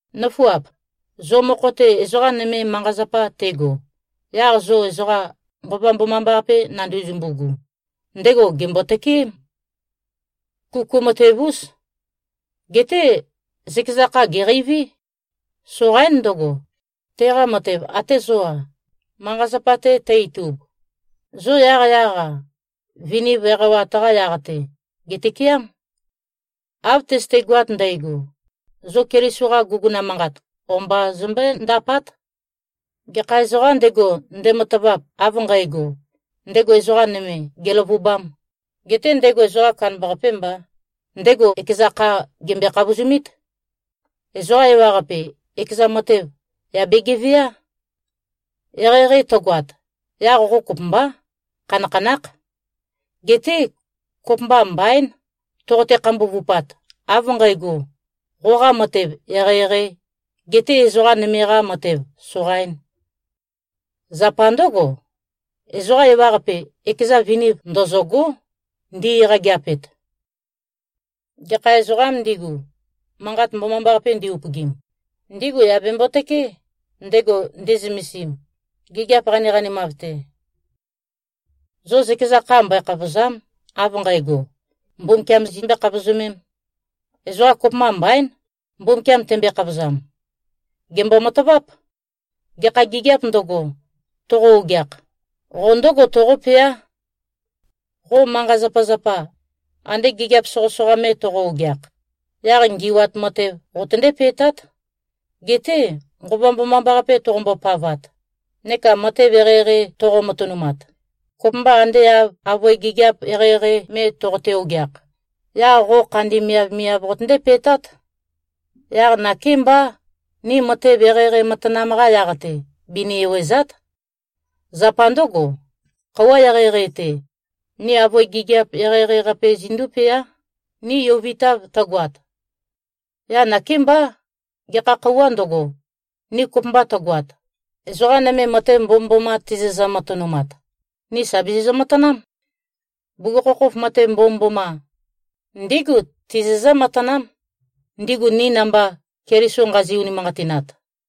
Nǿfuap! Zo mokho-te ezoqa nøme manqa-zapa tego, yaq zo ezoqa, Nqova Mbomambaqape nanduzumbu-gu, ndego gèmbo-tøkeém. Kuku matev-ús. Geté zøkeza kha, gèqeiví. Soqaín ndøgo, teqa matev, atē zō-a, manqa-zapa-te tø-itub. Zo yaqyaq-a, viniv eqawat-qa yaq-te, gètøkeám. Av tøzøtegoat ndægo, zo Keliso-qa guguna manqat o-mba zombøé-ndapát. Gekha ezoqām ndego, ndematavap, av nqægo, ndego ezoqa nøme gèløvubām, getē ndego ezoqa kandambaqapē mbā, ndego ekeza kha gèmbøe-khavozumít. Ezoqa ewaqape ekeza matev, yà begevewát. Eqeieqei tøgoat, yaq qo kopømbá, khanakhanákh. Geté kopømba mbaín, toqote-khambuvupat av nqægo, qoqa matev eqeieqeī, getē ezoqa nøme-qa matev soqaīn. Zapa ndǿgo, ezoqa ewaqape, ekeza viniv ndøzø̂gó, ndi-eqægeapet. Gekha ezoqām ndigu, Manqat Mbomambaqape ndi-upøgim, ndigu yà bembo-tøkeé, ndego nde꞉zømesim, gigiap qaniqanimav-te. Zo zøkeza kha mbøe-khavòza᷄m, av nqægo, Mbumbukiam zimbøē-khavozømēm. Ezoqa kopømba mbaín, Mbumbukiam tembøe-khavozam. Gèmbo-mataváp. Gekha gigiāp ndøgo, toqo-ogeakh, qo ndǿgo toqópeá. Qo manqa-zapazapa, ande gigiap soqøsoqa me toqo-ogeakh, yaq ngi꞉wat matev qotøndé-pe꞉tát. Geté Nqova Mbomambaqape toqombo-pavat neka matev eqeieqei toqo-matønumat, kopømba ande av avøe gigiap eqeieqei me toqote-ogeakh, yaq qo khandi miavmiav qotøndé-pe꞉tát. Yaq nakémbá, ni matev eqeieqei matanam-qa yaq-te, bini-ewèza᷄t. Zapa ndǿgo, khøuwa eqeieqei-te, ni avøe gigiap eqeieqei-qape zindúpeá, ni yovitav tøgoat. Yaq nakémbá, gekha khøuwā ndøgo, ni kopømba tøgoat, ezoqa nøme matev mbomømboma tizizø-matønumat, ni sà bizizø-matanám. Bugukhokhof matev mbomømboma, ndígu tizizǿ-matanám, ndigu ni namba Keliso nqazi-unimanqatinat.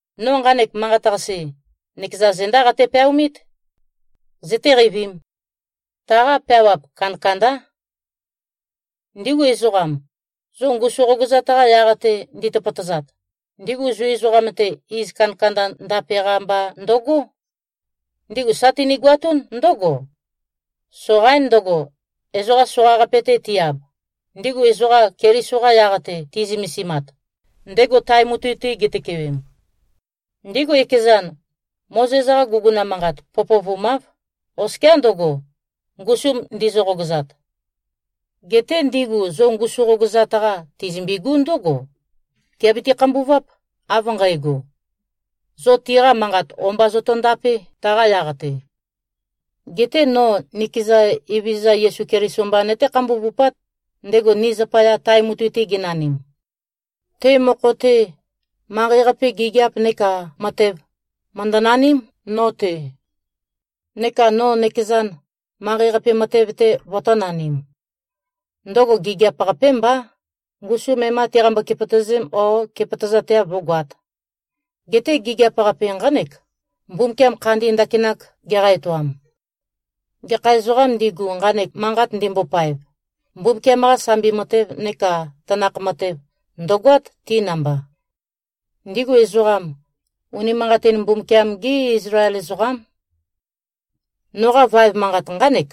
No nqanek manqat-qase, nøkeza zendá qate-peaomít. Zøtéqeivīm! Taqa peawap kandakandá. Ndigu ezoqam, zo ngusu qogøzat-qa yaq-te nditøpøtøzat, ndigu Zu ezoqam-te, iz kandakanda ndape-qa mba ndøgó. Ndigu sa tinigoatún ndǿgo: Soqaín ndøgo, ezoqa soqaqape-te ti-ab, ndigu ezoqa Keliso-qa yaq-te ti꞉zømesimat, ndego tae mutui-te gitøkewem. Ndigu ekezan, Mozes-qa guguna manqat pøpøvumáv, oskiá ndøgo, ngusum ndizø-qogøzat. Geté ndigu zo ngusu qogøzat-qa tizømbigú ndǿgo: Tìabiti-khambuváp, av nqægo: Zo tiqa manqat o-mba zotondapé, taqa yaq-te. Geté no nikeza Evezøza Yesu Keliso mba nøté-khambuvupát, ndego ni zapaya tae mutui-te genanim. Te mokho-te, manqei-qape gigiap neka matev, mø̀ndønaním, no-te. Neka no nøkezan, manqei-qape matev-te, vøtō-nanim. Ndøgo gigiap-qapé mbá, ngusum e-má tiqambø-kepøtø̀zēm, ó, kepøtøzateav vø̄goat. Geté gigiap-qape nqánek, Mbumbukiam khandi ndakinak geqa-etoam. Gekha ezoqām ndigu, nqanek manqat ndimbopaev, Mbumbukiam-qa sambi matev neka tanakh matev ndø̀goát, ti namba. Ndigu ezoqam, unimanqatin Mbumbukiam-gí Izlael ezoqám. Noqa vaev manqat nqánek: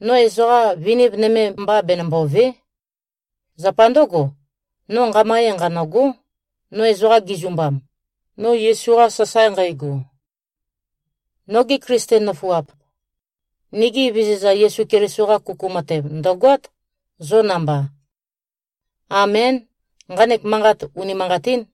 No ezoqa viniv nøme mba benømbòve᷄. Zapa ndǿgo, no nqama ee nqanø̂gó, no ezoqa gizumbam, no Yesu-qa sasae nqægo. Nogi Klisten nøfuap. Nigi Evezøza Yesu Keliso-qa kuku matev ndø̀goát, zo namba. Amén. Nqanek manqat unimanqatín.